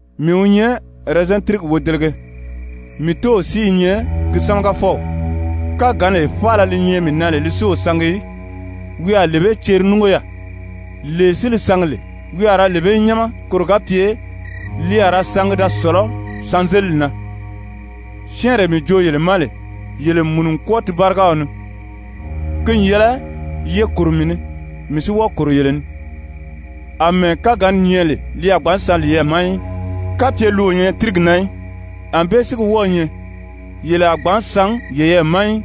«Mii wi nyɛ ɛrɛzɛn tírigi wodelege, mii Tóow si i nyɛ gi sámagafɔw. Káganlee faala li nyɛ mii na lè li si o sangi í, wi a lee bee ceri núngo yaà. Lee si li sangi lè, wi a ra lee bee nyáma, koro ga pye li a ra sangi da sɔ̀lɔ́ sanzelili na. Syɛ́ɛnree mii joo yele ma lè, yele n mùnu n kwɔ́ɔ ti báriga ni. Ki n yɛlɛ ye kòro mii ni, mii si wɔ́ɔ kòro yele ni. Amɛɛ káganni nyɛ lè li a gbǎn san liyɛɛ ma í, kapye li o nyɛ tírigi na í, ànbée si gi wɔ́ɔ̄ nyɛ, yele a gbǎn san yeyɛɛ ma í,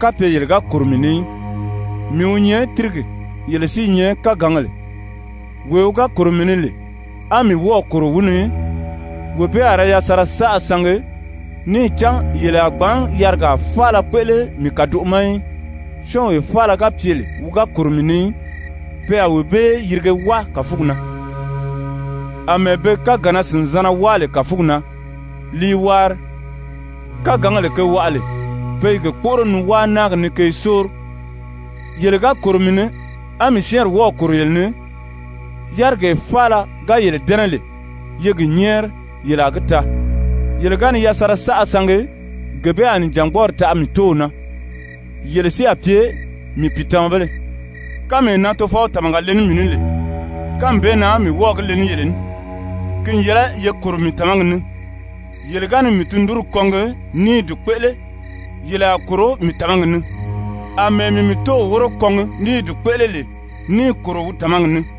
kapye yele ga kòro mii ni í. Mii wi nyɛ tírigi, yele si i nyɛ kágangèle. Wee wi ga kòro mii ni lè, á mii wɔ́ɔ̀ kòro wi ni, wee bee a ra yasanra saʔa sangi, níì cán yele a gbǎn yarigaa faala kpéʔele mii kàdoʔo ma í. Syɔ́ɔnwee faala ga pye lè wi ga kòro mii ni í, pe a wee bee yirige wáa kàfugi na, àmɛɛ be kágannaa-sìnzanna wáa lè kàfugi na li i waari. Kágangèle ge waʔa lè, pe i ge kpóʔoro ni wáa náagi ni ke i sóori. Yele ga kòro mii ni á mii syɛ́ɛnri wɔ́ɔ̀ kòro yele ni, yárigee faala ga yele dɛ́nɛ lè, ye gi nyɛ́ɛri, yele a gi taa. Yele ga ni yasanra saʔa sangi, gee bee a nìjangbɔɔri taʔa mii Tóow na, yele si a pye mii pìitamabéle. Kánmee na Tofɔw tàmaga le ní mii ní lè, kánmi bee na mii wɔ́ɔ̀ gi le ní yele ní. Ki n yɛlɛ ye kòro mii tàmagi ni. Yele ga ni mii tundunri kɔngi ní i di kpéʔele, yele a kòro mii tàmagi ni, àmɛɛ mii mii Tóow wóro kɔngi ní i di kpéʔele lè níì kòro wi tàmagi ni.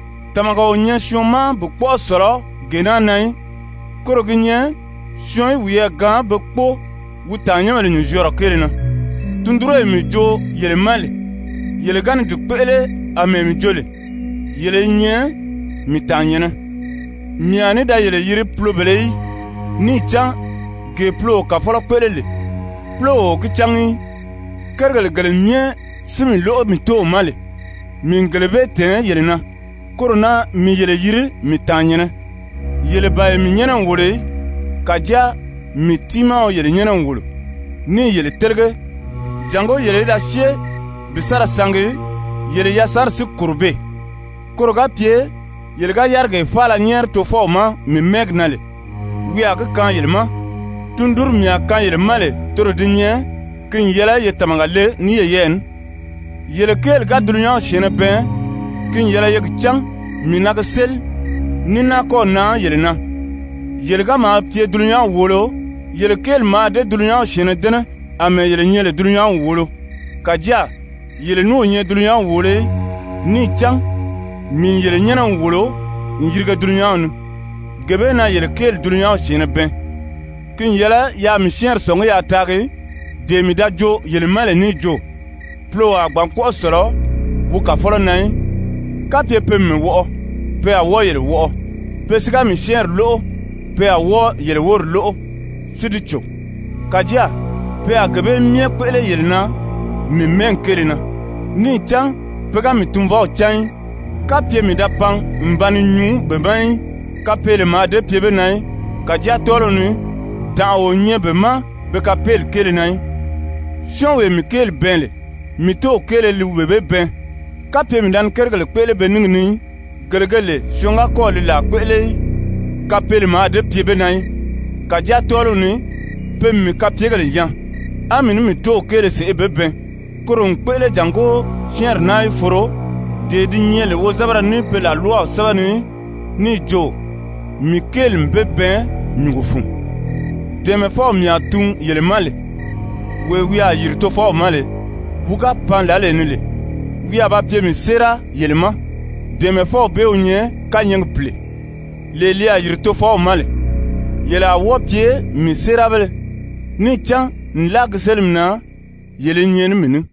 Tàmaga o nyɛ syɔɔn ma bi kpɔ́ʔɔ sɔ̀lɔ gee naa na í, koro gi nyɛ syɔɔn í wiyɛɛ gaan be kpóo wi tàannyɛnbèle nyùnzyɔɔrɔ kéele na. Tundunree mii joo yele ma lè, yele ga ni di kpéʔele àmɛɛ mii jo lè, yele i nyɛ mii tàannyɛ̀nnɛ. Mii a ní da yele yiri pulobèlē í, níì cán gee puloo kàfɔlɔ kpéʔele lè, púlow o gi cángi í. Kérigèle gele myɛ si mii lóʔo mii Tóow ma lè, mii n gele bee tɛ̀ɛn yele na, koro na mii yele yiri mii tàannyɛ̀nnɛ. Yele ban ye mii nyɛ́nɛ n wòlo í, kàjáa mii tiimaa wi yele nyɛ́nɛ n wòlo, níì yele télege, jàngó yele í da syée bi sa ra sangi, yele yasanri si kòro beè, koro ga pye yele ga yárigee faala nyɛ́ɛri Tofɔw ma mii mɛ́ɛgi na lè, wi a gi kaan yele ma. Tundunri mii a kaan yele ma lè toro di nyɛ, ki n yɛlɛ ye tàmaga le ní yeyɛɛ ní. «Yele kéeli ga dulunyanw syɛ̀ɛnnɛ bɛɛn, ki n yɛlɛ ye gi cán mii na gi séli ní náa kɔ́ɔ̀ nan yele na. Yele ga maa pye dulunyanw wòolo, yele kéeli mǎà dée dulunyanw syɛ̀ɛnnɛ dɛ́nɛ àmɛɛ yele nyɛ lè dulunyanw wòolo. Kàjáa yele ní o nyɛ dulunyanw wòolo í, níì cán mii n yele nyɛ́nɛ n wòlo n yirige dulunyanw ni. Gee bee na yele kéeli dulunyanw syɛ̀ɛnnɛ bɛɛn. Ki n yɛlɛ yaa mii syɛ́ɛnri sɔ̀ngí yaa taagi, dee mii da joo yele ma lè níì jo, puloo a gbǎn kpɔ́ʔɔ sɔ̀lɔ wi kàfɔlɔ na í. Kapye pe n mii wɔʔɔ, pe a wɔ́ɔ yele wɔʔɔ, pe si ga mii syɛ́ɛnri lóʔo, pe a wɔ́ɔ yele wóri lóʔo si di cò. Kàjáa pe a gee bee myɛ kpéʔele yele na mii mɛ́ɛgi kéele na, níì cán pe ga mii Tunvɔw cán í. Kapye mii da pan n ba ni nyuu be ma í, kapeele mǎà dée pye be na í. Kàjáa tɔ́ɔliw ni tànʔa o nyɛ be ma be kapeeli kéele na í. Syɔ́ɔnwee mii kéeli bɛɛn lè, mii Tóow kéele li wee bee bɛɛn. Kapye mii da ni kérigèle kpéʔele be níngi ni í, gele ge lè syɔɔn ga kɔ́ɔ̀ li làa kpéʔele í, kapeele mǎà dée pye be na í. Kàjáa tɔ́ɔliw ni pe n mii kapyegèle nyaa, á mii ní mii tóow kéele sèʔê be bɛɛn. Koro n kpéʔele jàngó syɛ́ɛnri naa í foro, dee di nyɛ lè wozɛbɛrɛ ní pe làlwaw sɛ́bɛ ni níì jo: ‹Mii kéeli n be bɛɛn nyùngo fun.› Dɛ̀ɛmɛfɔw mii a tun yele ma lè, wee wi a yìri Tofɔw ma lè, wi ga pan lǎlee ni lè, wi a ba pye mii séera yele ma, Dɛ̀ɛmɛfɔw bee wi nyɛ kányɛɛgi Pìle, lee li a yìri Tofɔw ma lè. Yele a wɔ́ɔ pye mii séerabéle níì cán nlaa gi sélimi na, yele i nyɛ ní mii ní.